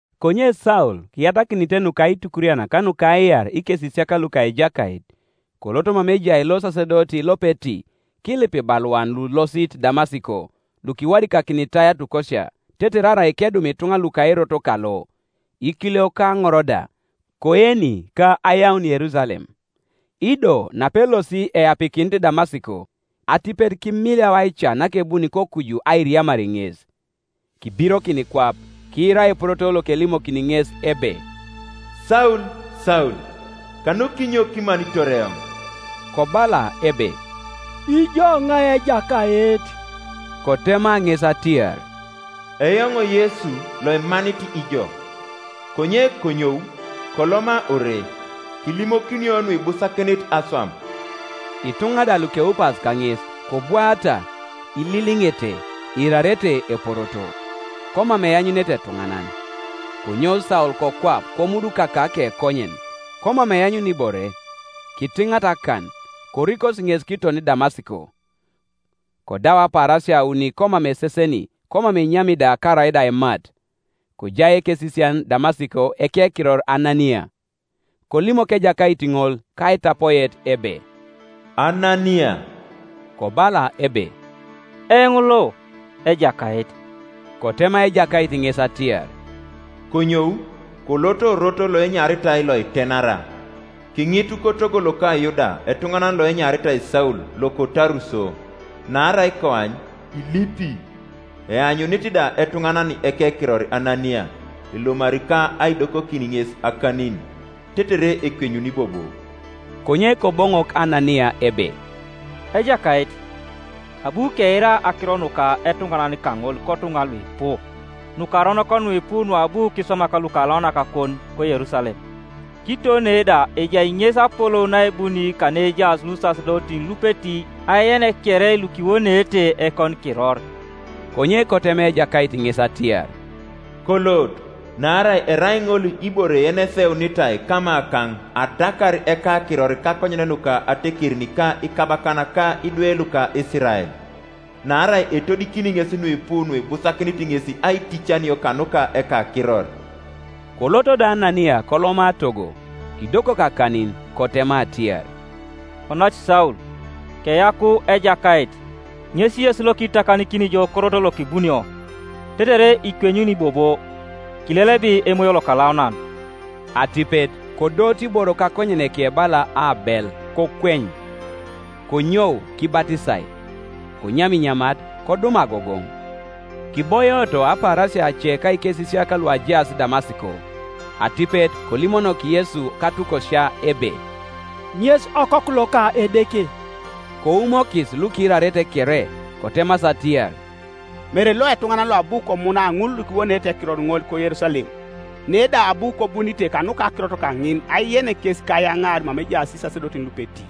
Konye Saul, kiyatakinite nukaitukurian ka nukaiar ikesisiak luka Ejakait, kolot mama ejai losasedoti lopeti, kilip ibaluan lulosit Damasiko lukiwadikakinitai atukosia, tetere arai kedum ituŋa luka Erot kalo, ikiliok ka aŋor da, koeni ka ayaun Yerusalem. Ido napelosi eapikinit Damasiko, atipet kimiliau aica nakebuni kokuju airiamar ŋes. Kibirokin kwap, kiira eporoto lokelimokini ŋes ebe, “Saul, Saul, kanukinyo kimanitor eoŋ?” Kobala ebe, “Ijo iŋai, Ejakait?” Kotema ŋes atiar, “Eoŋ Yesu loimanit ijo. Konye konyou, koloma ore, kilimokinio nuibusakinit aswam.” Ituŋa da lukeupas kaŋes, kobwaata ililiŋete, iirarete eporoto, komam eanyunete etuŋanan, Konyou Saul kokwap; komudukaka akekonyen, komam eanyuni ibore; kitiŋata akan, korikosi ŋes kiton Damasiko, Kodau apaarasia auni komam eseseni, komam enyami da karaida aimat. Kojai ekesisian Damasiko, ekekiror Anania, Kolimok Ejakait ŋol kaitapoet ebe, “Anania,” Kobala ebe, “Eoŋ lo, Ejakait.” Kotema Ejakait ŋes atiar, “Konyou, kolot orot loenyaritai Loitenara, kiŋitu kotogo loka Yuda etuŋanan loenyaritai Saul loko Taruso; naarai koany, ilipi, eanyunit da etuŋanan ekekiror Anania, elomari ka aidokokin ŋes akanin, tetere ekwenyuni bobo.” Konye Koboŋok Anania ebe, “Ejakait, abu keira akiro nuka etuŋanan kaŋol kotuŋa luipu, nukaronok nuipu nuabu kiswamak lukalaunakakon, koYerusalem; kiton ne da ejai ŋes apolou naebuni kaneejaas lusasedotin lupeti ajen kere lukiwoneete ekonikiror.” Konye kotema Ejakait ŋes atiar, “Kolot, naarai erai ŋol ibore yeneseunitai kamakaŋ adakar ekakiror kakonyen nuka atekerin ka ikabakan ka idwe luka Isirael; naarai etodikini ŋes nuipu nuibusakinit ŋes aiticanio kanuka ekakiror.” Kolot do Anania koloma togo. Kidokok akanin, kotema atiar, “Onac Saul, keyaku Ejakait, ŋes Yesu lokiitakanikini jo korot lokibunio, tetere ikwenyuni bobo, kilelebi Emoyo Lokalaunan.” Atipet kodooto iboro kakonyeneke bala aabel, kokweny. Konyou kibatisai, konyam inyamat, kodum agogoŋ. Kiboioto apaarasia ace ka ikesisiak luajaas Damasiko. Atipet kolimonok Yesu katukosia ebe, “Ŋes Okoku loka Edeke.” Koumokis lukiirarete kere, kotemasi atiar, “Mere lo etuŋanan loabu komuna ŋul lukiwoneete ekiror ŋol koYerusalem? Ne da abu kobunite kanuka akirot kaŋin ajen kes ka ayaŋaar mama ejaas isasedotin lupeti.”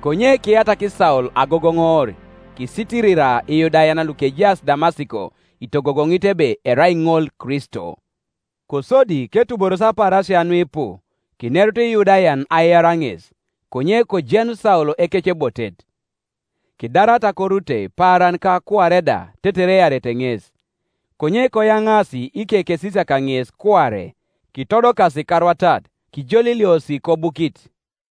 Konye kiyatak Saul agogoŋoor, kisitirira Iyudayan lukejaas Damasiko, itogogoŋit ebe erai ŋol Kristo. Kosodi ketuboros apaarasia nuipu, kinerut Iyudayan aiar ŋes, konye kojenu Saul ekecebotet. Kidarata korutei paaran ka kuare da tetere earete ŋes, Konye koyaŋaasi ikekesisiak ŋes kuare, kitodokasi karwatat, kijoliliosi kobukit.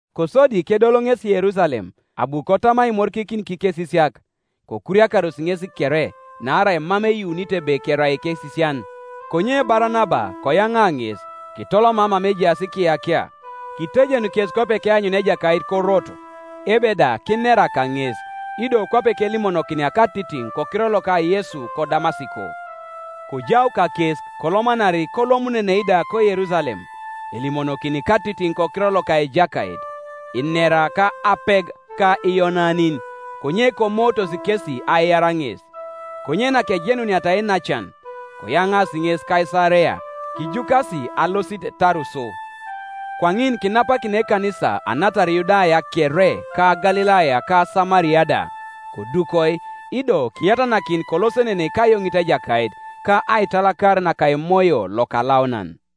Kosodi kedol ŋesi Yerusalem, abu kotam aimorikikin kikesisiak; kokuriakaros ŋes kere, naarai mam eyuunito ebe kerai ekesisian. Konye Baranaba koyaŋa ŋes, kitoloma mama ejaas ikiyakia, kitejen kes kwape keanyunia Ejakait koroto, ebe da kinera kaŋes, ido kwape kelimonokinia katitiŋ kokiror loka Yesu koDamasiko. Kojau kakes kolomanari kolomununei da koYerusalem, elimonokini katitiŋ kokiror loka Ejakait; inera ka apeg ka Iyonanin; konye komootos kesi aiar ŋes. Konye nakejenuniata iinacan, koyaŋaasi ŋes Kaisarea, kijukasi alosit Taruso. Kwaŋin kinapakina ekanisa anatar Yudaya kere ka Galilaya ka Samaria da, kodukoi; ido kiyatanakin kolosenenei kayoŋit Ejakait, ka aitalakar naka Emoyo Lokalaunan.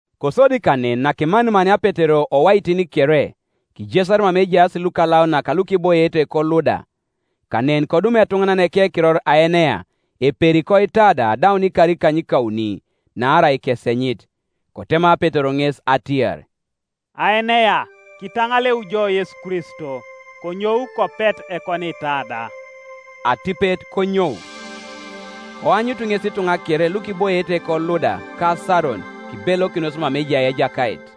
Kosodi kanen nakimanimania Petero owaitin kere, kijesar mama ejaas lukalaunak lukiboiete koLuda. Kanen kodum etuŋanan ekekiror Aenea, eperi koitada adaun ikar ikanykauni, naarai kesenyit. Kotema Petero ŋes atiar, “Aenea, kitaŋaleu jo Yesu Kristo; konyou, kopet ekoniitada.” Atipet konyou. Koanyutu ŋes ituŋa kere lukiboiete koLuda, ka Saron, kibelokinos mama ejai Ejakait.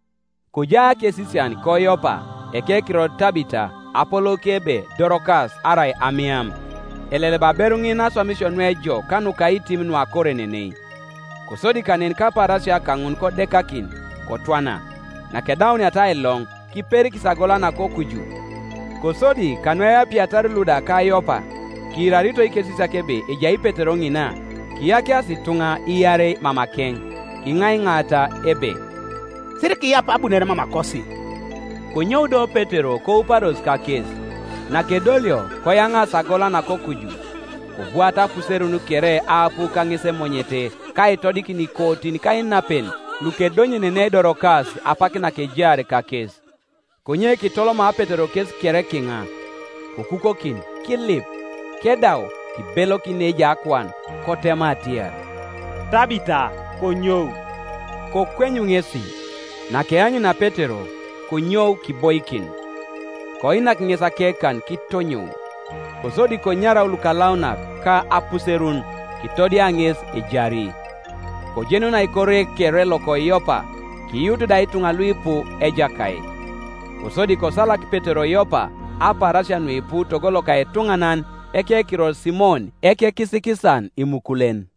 Kojai akesisian koYopa, ekekiror Tabita, apolouke ebe Dorokas arai Amiam. Eleleba aberu ŋin aswamisio nuejok ka nukaitim nuakorenenei. Kosodi kanen kapaarasia kaŋun kodekakin, kotwana; nakedauniata ailoŋ, kiperikis agola nakokuju. Kosodi kanueapiatar Luda ka Yopa, kiirarito ikesisiak ebe ejai Petero ŋina, kiyakiasi ituŋa iarei mamakeŋ, kiŋaiŋaata ebe, “Sirikiyap abunore mamakosi.” Konyou do Petero kouparos kakes. Nakedolio, koyaŋaasi agola nakokuju. Kobwaata apuserun kere aapu kaŋes emonyete, ka aitodikin ikootin ka inapen lukedonyenenei Dorokas apak nakejaar kakes. Konye kitoloma Petero kes kere kiŋa, kokukokin, kilip; kedau, kibelokin neejai akuan, kotema atiar, “Tabita, konyou.” Kokwenyu ŋesi; nakeanyunia Petero, konyou kiboikin. Koinak ŋes akekan kitonyou; kosodi konyarau lukalaunak ka apuserun, kitodia ŋes ejari. Kojenunai kore kere loko Yopa, kiyuutu da ituŋa luipu Ejakait. Kosodi kosalak Petero Yopa apaarasia nuipu togo loka etuŋanan ekekiror Simon, ekekisikisan imukulen.